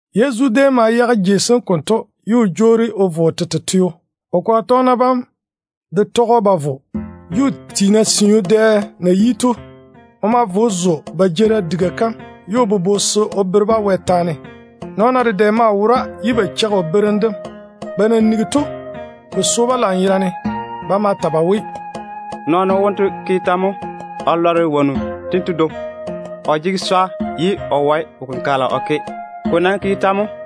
Yezu déem ma yage jei sem konto ye o jwoori o vo o tete teo. O kwaga tɔgena bam de tɔge‑o ba vo. Juu tiina siu dɛ na yi to, o ma vo o zo ba jeerim diga kam ye o bobo se o bere-ba Wɛ taane. Nɔɔna dedɛ maa wora ye ba cheigi o berem dem. Ba na nigi to, ko so-ba lanyerane. Ba ma ta ba we, “Nɔɔno wonto ke tɛ mo o lɔre wonnu tento dwoŋi? O jege swa ye o wae wo-kenkagela o ke. Ko nam ke tɛ mo?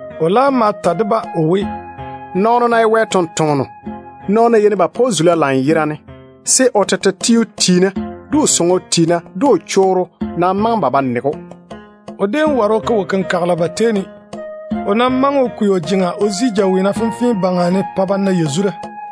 O laam ma ta de-ba o we, “Nɔɔno ná ye Wɛ ni-jwoŋinu, nɔɔna yeini ba pa‑o zula lanyerane, se o tete teo tiina de o sɔŋɔ tiina de o chorro nam maŋe ba ba nege‑o.” O déem ware o ke wo-kenkagela ba tei ne, ko ná dae o na kwei o jeŋa o daŋe jaweena fenfee yerane baŋa ne o pa ba na yazura to.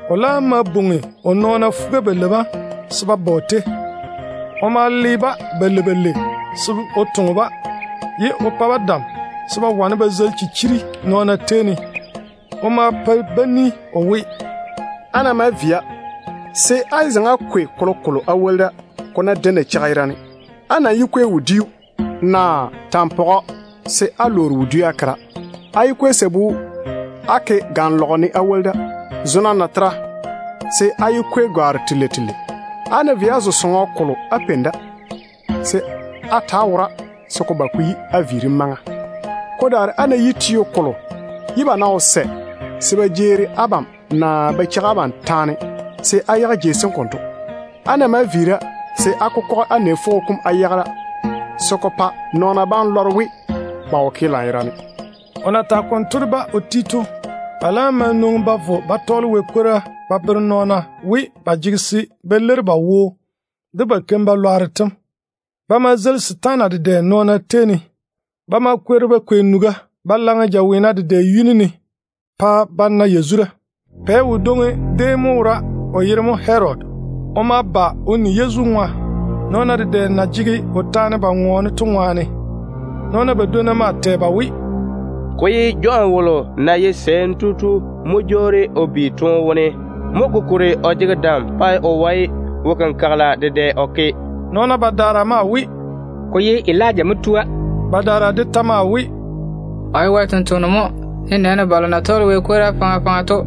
O laam ma bwoŋi o nɔɔna fuga-balei bam se ba ba o tei. O ma le-ba balei balei se o toŋe-ba, ye o pa-ba dam se ba wane ba zeili chichiri-lwanno nɔɔna tei ne. O ma pa-ba ni o we, “Á ná maa via, se á yé zaŋe á kwei kolokolo á woli da, ko ná dae nacheiga yerane. Á nam yé kwei wodiu, naa tampɔgɔ se á lwoori wodiu á ke da. Á yé kwei sabu á ke ganlɔgere ne á woli da. Zo-na natera, se á yé kwei gwaaro telei telei. Á ná vei á zo sɔŋɔ kolo á peini da, se á ta‑á wora se ko ba ko yi á viirim maŋa. Ko daare á ná yi teo kolo, ye ba ná wo sɛ se ba jeeri abam naa ba cheigi abam taane, se á yage jei sem konto. Á ná maa viira, se á kokɔge á nɛ fwogo kom á yage da, se ko pa nɔɔna bam lɔre we ba wo ke lanyerane.” O na tage konto de ba o ti to, ba laam ma nwoŋi ba vo ba tɔɔle Wɛ kwora ba bere nɔɔna we ba jege se ba leiri ba wo de ba keim-balwaaro tem. Ba ma zeili setaana dedɛ nɔɔna tei ne. Ba ma kwori ba kwei nuga ba laŋe jaweena dedɛ yuni ne pa ba na yazura. Pɛ wodwoŋi déem mo wora, o yere mo Herodi. O ma ba o ni Yezu ŋwa, nɔɔna dedɛ na jege o taane ba ŋɔɔne to ŋwaane. Nɔɔna badwonna maa tɛ ba we, “Ko ye Jɔn wolo na ye sɛɛm tu to mo jwoori o bi toone wone. Mo kokuri o jege dam pa o wae wo-kenkagela dedɛ o ke.” Nɔɔna badaara maa we, “Ko ye Elija mo tua.” Badaara de ta maa we, “O ye Wɛ sampwora mo, nenɛɛne balo na tɔɔle Wɛ kwora faŋa faŋa to.”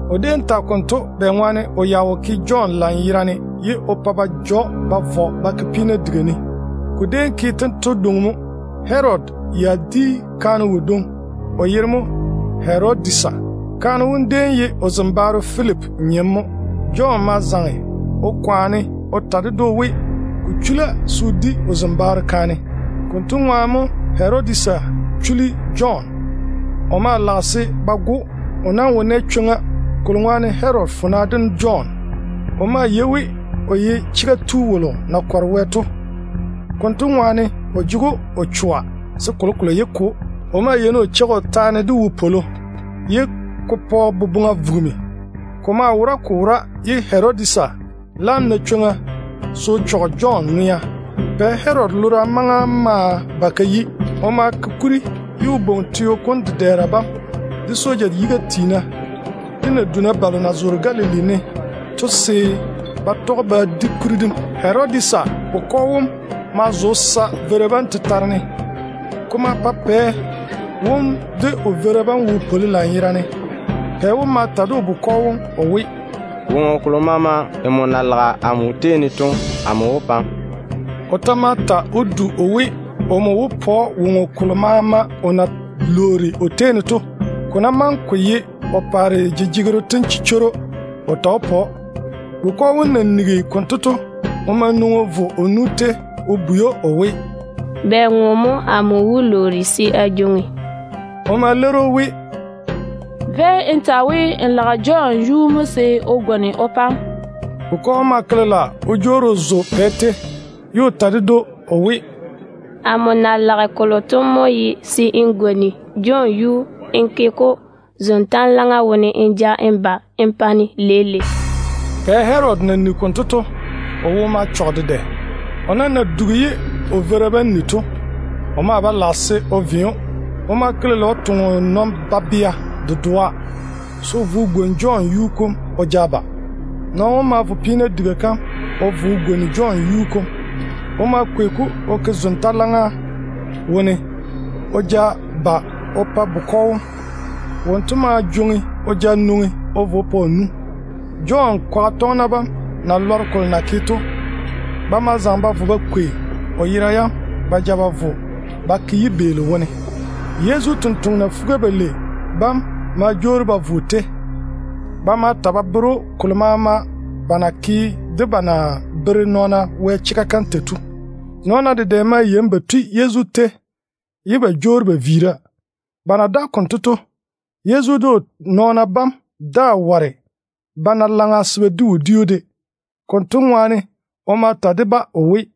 O déem tage konto bɛŋwaane o ya wo ke Jɔn lanyerane ye o pa ba ja‑o ba vɔ ba ke peena diga ne. Ko déem ke tento dwoŋi mo: Herodi ya di kaane wodwoŋi, o yere mo Herodisa. Kaane wom déem ye o zembaaro Filipi nyem mo. Jɔn ma zaŋe o ta ded‑o we, ko chula se o di o zembaaro kaane. Konto ŋwaane mo Herodisa chuli Jɔn. O maa lage se ba go‑o. O nam wo nɛ chwoŋa, kolo ŋwaane Herodi kɔre Jɔn. O maa yei we o ye wo-pwoŋo tu na kɔre Wɛ to. Konto ŋwaane o jege‑o o choa se kolokolo yé ke‑o. O maa yeini o cheigi o taane de wopwolo, ye ko pa o boboŋa vugimi. Ko maa wora ko wora ye Herodisa laam na chwoŋa se o chɔge Jɔn ŋwea. Pɛ Herodi lora maŋa ma ba ka yi. O ma ke kuri ye o bwoŋi teo kom dedɛɛra bam, de soja yiga tiina, de naduna balo na zoore Galili ne to se ba tɔge ba di kuri dem. Herodisa bukɔ wom ma zo o sa veira bam tetare ne. Ko ma pa pɛ wom de o veira bam wo pwoli lanyerane. Pɛ wom ma ta de bukɔ wom o we, “Woŋo kolo maama nmo na lage to, amo wó pa‑m.” O ta ma ta o du o we, omo wó pa‑o woŋo kolo maama o na wó lwoori o tei ne to, ko ná maŋe ko ye o paare jejegero tem chichworo de. Bukɔ wom na nigi konto to, o ma nwoŋi o vo o nu tei o bwei‑o o we, “Bɛ ŋo mo amo wó lwoori se a jwoŋi?” O ma leiri o we, “Véi n ta we n lage Jɔn yuu mo se o gwoni o pa‑m.” Bukɔ wom ma ke lela o jwoori o zo pɛ tei, ye o ta ded‑o o we, “Amo na lage kolo to mo ye se n gwoni Jɔn yuu n ke-ko zon-tanlaŋa wone n ja n ba n pa-ne leile.” Pɛ Herodi na nigi konto to, o wo ma chɔge dedɛ. O nam na dugi ye o veira bam ni to, o maa ba lage se o ve‑o. O ma ke lela o toŋe o nɔn-babea dedoa se o vo o gwoni Jɔn yuu kom o ja ba. Nɔɔno wom ma seene o vo peena diga kam o gwoni Jɔn yuu kom. O ma kwei-ko o ke zon-tanlaŋa wone o ja ba o pa bukɔ wom. Wonto ma jwoŋi o ja nwoŋi o vo o pa o nu. Jɔn kwaga tɔgena bam na lɔre kolo na ke to, ba ma zaŋe ba vo ba kwei o yera yam ba ja vo ba ke yibeeli wone. Yezu totoŋa nakwa fuga-balei bam ma jwoori ba vo o tei. Ba ma ta ba bere‑o kolo maama ba na ke de ba na bere nɔɔna Wɛ chega kam tei to. Nɔɔna dedɛ maa yeini ba tui Yezu tei ye ba jwoori ba viira. Ba na daga konto to, Yezu de o nɔɔna bam daa ware ba na laŋa se ba di wodiu de. Konto ŋwaane o ma ta de-ba o we,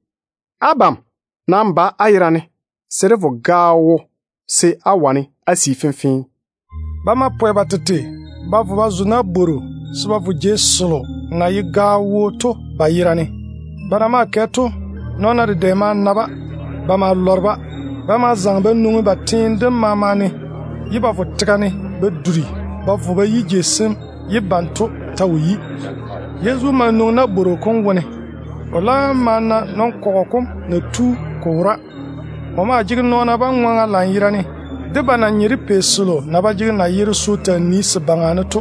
“Abam nam ba á yerane se dé vo gaao wo se á wane á sii fenfee.” Ba ma pwɛ ba tete ba vo ba zo nabworo se ba vo jei selo na ye gaao wo to ba yerane. Ba na maa kɛ to, nɔɔna dedɛ ma na-ba. Ba ma lɔre-ba. Ba ma zaŋe ba nwoŋi ba teene dem maama ne, ye ba vo tega ne ba duri ba vo ba yi jei sem ye banto ta wo yi da. Yezu ma nwoŋi nabworo kom wone. O laam ma na nɔn-kɔgɔ kom na tu ko wora. O maa jege nɔɔna bam ŋwaŋa lanyerane, de ba na nye de pei selo na ba jege nayero se o taa nii se baŋa ne to.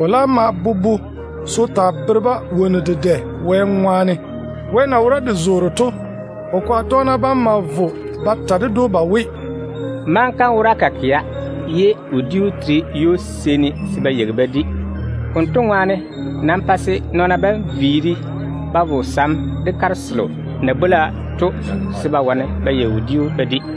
O laam ma bobo se o taa bere-ba wonnu dedɛ. Wɛ na wora de zoore to, o kwaga tɔgena bam ma vo ba ta ded‑o ba we, “Maŋa kam wora ka kɛa ye wodiu tera ywo-seeni se ba yeigi ba di. Konto ŋwaane, pa se nɔɔna bam vo sam wone ba yeigi wodiu ba di.”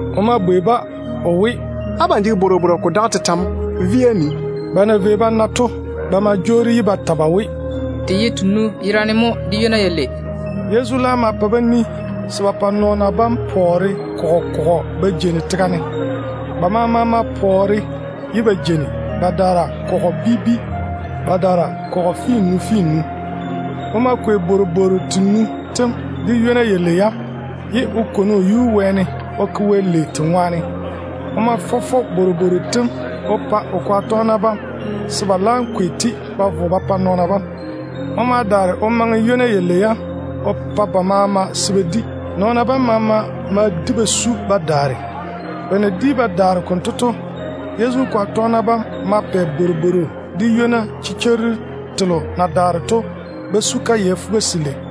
O ma bwei-ba o we, “Abam jege bworobworo ko mae tetɛ mo? Véi-na á nii.” Ba na vei ba na to, ba ma jwoori ye ba ta ba we, “Te ye tenu yerane mo, de ywona yalei.” Yezu laam ma pa-ba ni se ba pa nɔɔna bam pɔɔre kɔgɔ kɔgɔ ba jeini tega ne. Ba maama ma pɔɔre ye ba jeini, badaara kɔgɔ bi bi, badaara kɔgɔ finnu finnu. O ma kwei bworobwooru tenu tem de ywona yalei yam, ye o kwoni o yuu wɛɛne o ke Wɛ lei te ŋwaane. O ma fɔ fɔ bworobwooru tem o pa o kwaga tɔgena bam se ba laam jwoŋi-te ba ja vo ba maŋe ba pa nɔɔna bam. O ma daare o maŋe ywona yalei yam o pa ba maama se ba di. Nɔɔna bam maama ma di ba su ba daare. Ba na di ba daare konto to, Yezu kwaga tɔgena bam ma pɛ bworobworo de ywona chichwooru telo na daare to ba su kayɛ fuga-selei.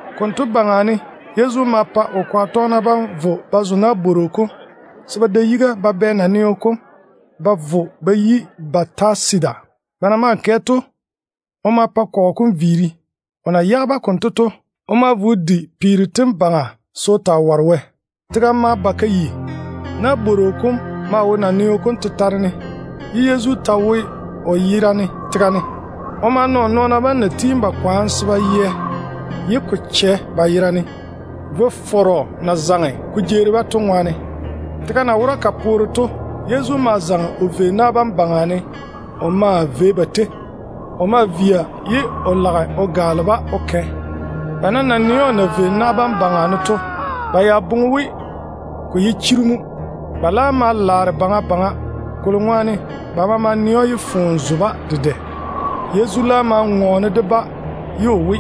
Konto baŋa ne Yezu ma pa o kwaga tɔgena bam vo ba zo nabworo kom se ba da yiga ba bɛ naneo kom ba vo ba yi Bɛtasida. Ba na maa kɛ to, o ma pa kɔgɔ kom viiri. O na yage-ba konto to, o ma vo o di peero tem baŋa se o ware Wɛ. Tega ma ba ka yi. Nabworo kom maa wo naneo kom tetare ne, ye Yezu ta wo buburu kom ne o yerane. O ma tole o na o nɔɔna bam na tiini ba kwaane se ba yɛ ye ko chɛ ba yera ne, vo-fɔrɔ na zaŋe ko jeeri-ba to ŋwaane. Tega na wora ka poore to, Yezu ma zaŋe o nɔne na bam baŋa ne o maa vei ba tei. O maa via ye o lage o gaale-ba o kɛ. Ba nam na nɛ‑o o na vei na bam baŋa ne to, ba ya boŋe we ko wó taa ye chiru mo. Ba ma laare baŋa baŋa, ba maama na nɛ‑o ye foone zo-ba dedɛ to ŋwaane. Yezu laam ma ŋɔɔne de-ba o we,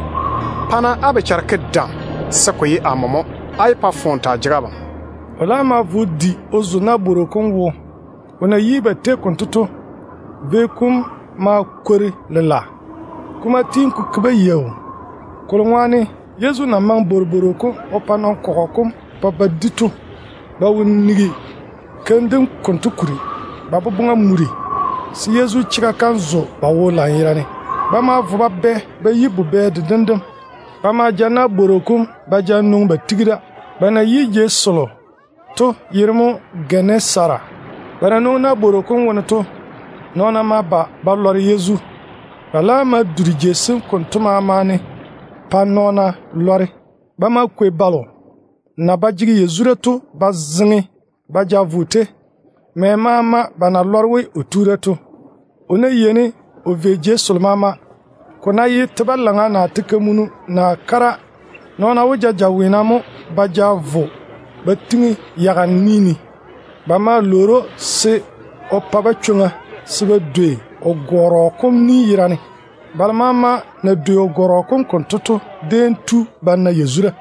“Pa-na á bochara ke dam, se ko ye amo mo. Á yé pa foone taa jege abam.” O laam ma vo o zo nabworo kom wo. O na yi ba tei konto to, vio kom ma kwori lela. Ko ma tiini ko ke-ba yaau, kolo ŋwaane Yezu na maŋe bworobworo kom o pa nɔn-kɔgɔ kom pa ba di to, ba wo nigi keim dem konto kuri. Ba boboŋa muri se Yezu chega kam zo ba wo lanyerane. Ba ma vo ba bɛ bubɛ dedem dem. Ba ma ja nabworo kom ba nwoŋi ba tiŋi da. Ba na yi jei selo to yere mo Gɛnesara. Ba na nwoŋi nabworo kom wone to, nɔɔna ma ba ba lɔre Yezu. Ba laam ma duri jei sem konto maama ne pa nɔɔna lɔre. Ba ma kwei balo na ba jege yazura to ba zeŋe ba ja vo o tei, mɛ maama ba na lɔre we o tu da to. O na yeini o vei jei selo maama to, ko ná ye teo balaŋa, naa teo kamunu, naa kara, nɔɔna yeini ba ja jaweena mo ba vo ba tiŋi yaga ni ne. Ba ma lwoori‑o se o pa-ba chwoŋa se ba dwei o gɔrɔ kom ni yerane. Balo maama na dwei o gɔrɔ kom konto to déem nɛ yazura.